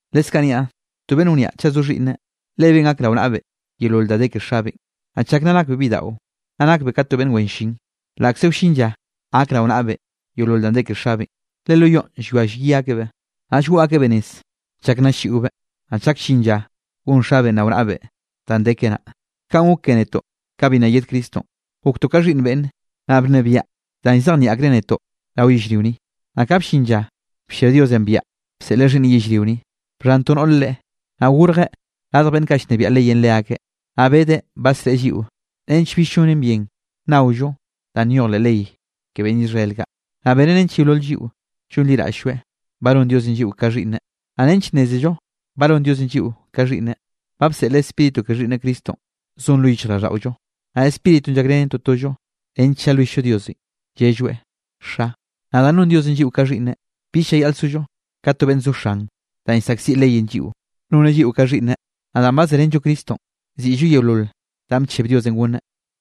Leskaꞌ niaꞌ: To beꞌnn wniaꞌ chaꞌ zo xhiꞌnneꞌ, lebeꞌn gak rao naꞌbeꞌ yeolol da de ke xabeꞌn. Naꞌ chak nna nakbeꞌ bidaꞌo, nna nakbeꞌ ka to beꞌnn wen llin, laꞌkze wllin lla gak rao naꞌbeꞌ yeolol danꞌ de ke xabeꞌn. Le lo yoꞌn llwia llyi akebeꞌ, naꞌ llgoꞌ akebeꞌ nez chak nna ll-lliꞌobeꞌ, naꞌ chak llin lla gon xabeꞌn rao naꞌbeꞌ danꞌ de keꞌe naꞌ. Kaꞌn gok ke netoꞌ kanꞌ bi nna yed Cristonꞌ, goktoꞌ ka xhiꞌnn beꞌnne, naꞌ bnebiaꞌ danꞌ llzejnieꞌ akreꞌ netoꞌ rao yellrio ni. Naꞌ ka bllin lla bllia Diosenꞌ biaꞌa bseꞌleꞌ Xhiꞌnneꞌn yellrio ni, bxhan to noꞌre Leꞌe. Naꞌ gorjeꞌ radj beꞌnn kaꞌ llnebiaꞌ leyenꞌ leakeꞌ. Naꞌ bedeꞌ badsreꞌe lliꞌo nench bill llonen bien nnaollo danꞌ nyoj leꞌ ley ke beꞌnn Israel kaꞌ, naꞌ beneꞌ nench yeolol lliꞌo llonliraꞌll-lloeꞌ ba non Diosenꞌ lliꞌo ka xhiꞌnneꞌ. Naꞌ nench nnézello ba non Diosenꞌ lliꞌo ka xhiꞌnneꞌ, ba bseꞌleꞌ Spíritu ke Xhiꞌnneꞌ Cristonꞌ zon lo yichjraꞌlldaꞌollo, naꞌ Spíritunꞌ llakrenen totollo nench llalwill-llo Diosenꞌ llelloeꞌ: “Xa”. Naꞌ danꞌ non Diosenꞌ lliꞌo ka xhiꞌnneꞌ, bill llayaꞌl sollo ka to beꞌnn zo xan danꞌ llsaꞌkziꞌ leyenꞌ lliꞌo; noneꞌ lliꞌo ka xhiꞌnneꞌ, naꞌ danꞌ ba zerenllo Cristonꞌ siꞌllo yeolol danꞌ bcheb Diosenꞌ gonneꞌ.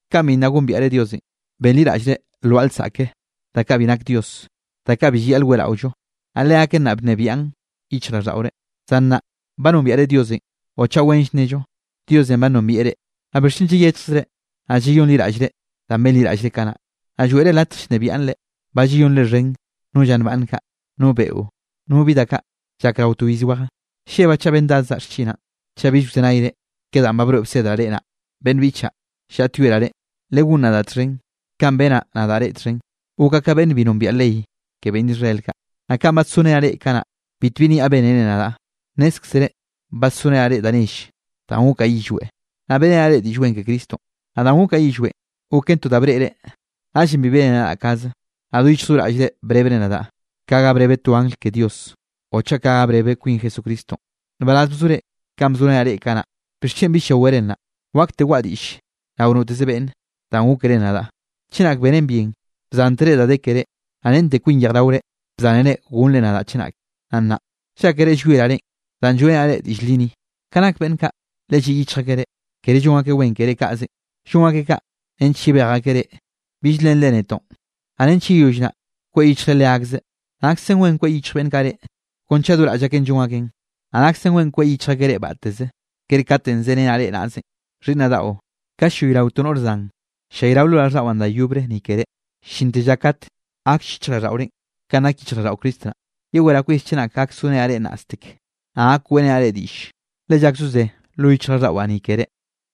Kanꞌ bi nna gombiaꞌre Diosenꞌ, benliraꞌllre lwaꞌa lsaꞌke da kaꞌ bi nak Dios, da kaꞌ bi llayaꞌl weꞌraollo, naꞌ leaken naꞌ bnebiaꞌn yichjraꞌlldaꞌore. Zan nnaꞌ ba nombiaꞌre Diosenꞌ o chaꞌ wenll nello Diosenꞌ ba nombieꞌ reꞌ. ¿Naꞌ bixchen llayechjzre, naꞌ yeyonliraꞌllre da benliraꞌllre kanaꞌ, naꞌ lloeꞌre latj llnebiaꞌn reꞌ? Ba llayonre xhen no lla nbaꞌnn kaꞌ, no beꞌo, no bi da kaꞌ llak rao to iz weje. Llebaꞌ chaꞌ bendadzaꞌ xchinaꞌn, chaꞌ bill wzenayre ke danꞌ ba broeꞌ bsedraꞌ reꞌ naꞌ. Beꞌnn biꞌchaꞌ, llaꞌtyoeraꞌ reꞌ legón nadaꞌ txhen kanꞌ benaꞌ nadaꞌ reꞌ txhen, gokaꞌ ka beꞌnn bi nombiaꞌ ley ke beꞌnn Israel kaꞌ. Naꞌ kanꞌ badsorenaꞌ reꞌ kanaꞌ, bitbi niaꞌ bénere nadaꞌ. Nnézkzere badsorenaꞌ reꞌ da nelle danꞌ gokaꞌ yillweꞌ, naꞌ beꞌrenaꞌ reꞌ Diꞌll Wen ke Cristonꞌ. Naꞌ danꞌ gokaꞌ yillweꞌn goken to da breꞌre. Naꞌllenꞌ bi bénere nadaꞌ kaze, naꞌ do yichj do raꞌllre brebre nadaꞌ ka ga brebe to angl ke Dios o chaꞌ ka ga brebe kwin Jesucristonꞌ. Nbaraz bzore kanꞌ bzorenaꞌ reꞌ kanaꞌ. ¿Bixchen bill llawere nnaꞌ? Wakte waꞌa diꞌll rao noteze beꞌnn danꞌ gókere nadaꞌ. Chenak benen bien, bzántere da de kere, naꞌ rente kwin yejraore bzánere gonnre nadaꞌ chenake. Naꞌ nnaꞌ, ¿llákere llwieraꞌ reꞌn danꞌ lloeꞌrenaꞌ reꞌ diꞌll li ni? Ka nak beꞌnn kaꞌ, le lliꞌ yichj akeꞌ reꞌ, kere llon akeꞌ wen keré kaꞌzenꞌ, llon akeꞌ kaꞌ nench yebej akeꞌ reꞌ, bill lenre netoꞌn, naꞌ nench yeyoll naꞌ kweꞌ yichjre leakzeꞌ. Naksen wen kweꞌ yichj beꞌnn kaꞌ reꞌ, kon chaꞌ do raꞌll akeꞌn llon akeꞌn. Naꞌ naksen wen kweꞌ yichj akeꞌ reꞌ batteze, kere katenꞌ zerenaꞌ reꞌ naꞌzenꞌ. Xhiꞌnnaꞌ daꞌo, ka ll-llayrao to noꞌr zan, ll-llayrao lo raꞌlldaꞌwaꞌ da yobre ni keré, llinte lla kat gakll yichjraꞌlldaꞌorenꞌ ka nak yichjraꞌlldaꞌo Cristo naꞌ. Yeweraꞌ kwis chenak gak sorenaꞌ reꞌ nnaꞌstek, naꞌ gak weꞌrenaꞌ reꞌ diꞌll, le llak zozé lo yichjraꞌlldaꞌwaꞌ ni keré.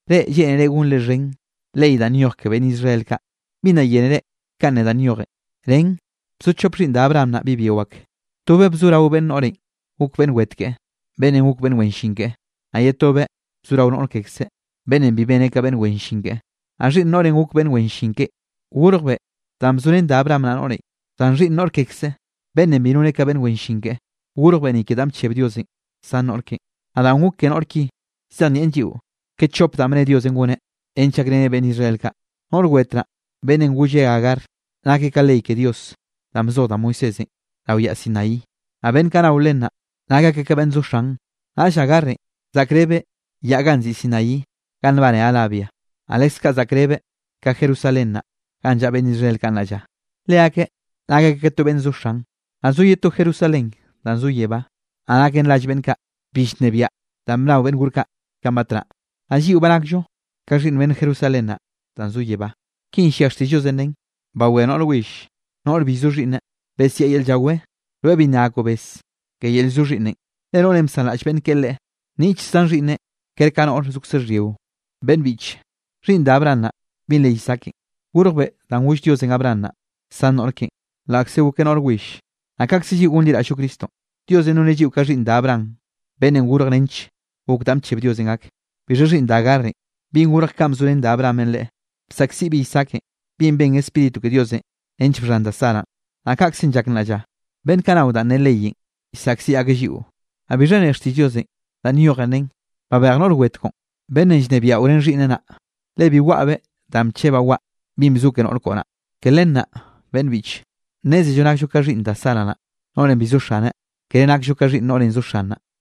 Reꞌ, lleꞌnere gonre xhen ley danꞌ nyoj ke beꞌnn Israel kaꞌ, ¿bi nna yénere kanꞌ ne danꞌ nyojen? Nen bzo chop xhiꞌnn da Abraham naꞌ bi byio ak, tobeꞌ bzo rao beꞌnn noꞌrenꞌ, gok beꞌnn wet keꞌe, beꞌnnenꞌ gok beꞌnn wen llin keꞌe, naꞌ ye tobeꞌ bzo rao noꞌr kekzeꞌ, beꞌnnenꞌ bi beneꞌ ka beꞌnn wen llin keꞌe. Naꞌ xhiꞌnn noꞌrenꞌ gok beꞌnn wen llin keꞌe, gorjbeꞌ danꞌ bzorén da Abraham naꞌ noꞌrenꞌ, zan xhiꞌnn noꞌr kekzeꞌ, beꞌnnenꞌ bi noneꞌ ka beꞌnn wen llin keꞌe, gorjbeꞌ ni ke danꞌ bcheb Diosenꞌ san noꞌr keꞌen. Naꞌ danꞌ gok ke noꞌr ki llzejnieꞌn lliꞌo ke chop danꞌ bne Diosenꞌ goneꞌ nench gakreneꞌ beꞌnn Israel kaꞌ. Noꞌr wet naꞌ, beꞌnnenꞌ golle Agar, nakeꞌ ka ley ke Diosenꞌ danꞌ bzoj da Moisésenꞌ rao yaꞌ Sinaí. Naꞌ beꞌnn kaꞌ nao len naꞌ, nak akeꞌ ka beꞌnn kaꞌ zo xan. Naꞌll Agarenꞌ zaꞌkrebeꞌ yaꞌ ganꞌ nziꞌi Sinaí ganꞌ nbane Arabia, naꞌ leskaꞌ zaꞌkrebeꞌ ka Jerusalén naꞌ ganꞌ llaꞌa beꞌnn Israel kaꞌ nnaꞌ lla. Leakeꞌ nak akeꞌ ka to beꞌnn zo xan. Naꞌ zo ye to Jerusalén danꞌ zo yebá, naꞌ naken rall beꞌnn kaꞌ bi llnebiaꞌ da bnao beꞌnn gor kaꞌ kanꞌ batnaꞌ, naꞌ lliꞌo ba nakllo ka xhiꞌnn beꞌnn Jerusalén naꞌ danꞌ zo yebá. Kinꞌ llia xtiꞌll Diosenꞌ nen: Bawé noꞌr will, noꞌr bi llzo xhiꞌnneꞌ, besiaꞌ yel llawé, rweꞌ bi nna gakoꞌ bes ke yel llzo xhiꞌnneꞌn. Le noꞌrenꞌ bsanraꞌll beꞌnn keꞌe leꞌe, nniꞌtll zan xhiꞌnneꞌ ker ka noꞌr zokze xhyio. Beꞌnn biꞌche, xhiꞌnn da Abraham naꞌ binꞌ re Isaakenꞌ, gorjbeꞌ danꞌ goll Diosenꞌ Abraham naꞌ san noꞌr keꞌen, laꞌkze gokeꞌ noꞌr will. Naꞌ kaꞌkze lliꞌo gonliraꞌll-llo Cristonꞌ, Diosenꞌ noneꞌ lliꞌo ka xhiꞌnn da Abraham beꞌnn gorj nench gok danꞌ bcheb Diosenꞌ gak. Bixha xhiꞌnn da Agarenꞌ, binꞌ gorj ka bzorén da Abrahamenꞌ leꞌe, bsaꞌkziꞌbeꞌ Isaakenꞌ binꞌ ben Spíritu ke Diosenꞌ nench bxhan da Saranꞌ. Naꞌ kaꞌkzenꞌ llak nnaꞌ lla, beꞌnn kaꞌ nao danꞌ ne leyenꞌ llsaꞌkziꞌ akeꞌ lliꞌo. ¿Naꞌ bixha ne xtiꞌll Diosenꞌ? Danꞌ nyojen nen: “Babej noꞌr wet koꞌon, beꞌnnenꞌ llnebiaꞌo ren xhiꞌnneꞌ naꞌ, le bi waꞌabeꞌ danꞌ bchebaꞌ waꞌa binꞌ bzo ke noꞌr koꞌo naꞌ.” Ke len naꞌ beꞌnn biꞌche, nnézello nakllo ka xhiꞌnn da Sara naꞌ, noꞌrenꞌ bi zo xaneꞌ, kere nakllo ka xhiꞌnn noꞌrenꞌ zo xan naꞌ.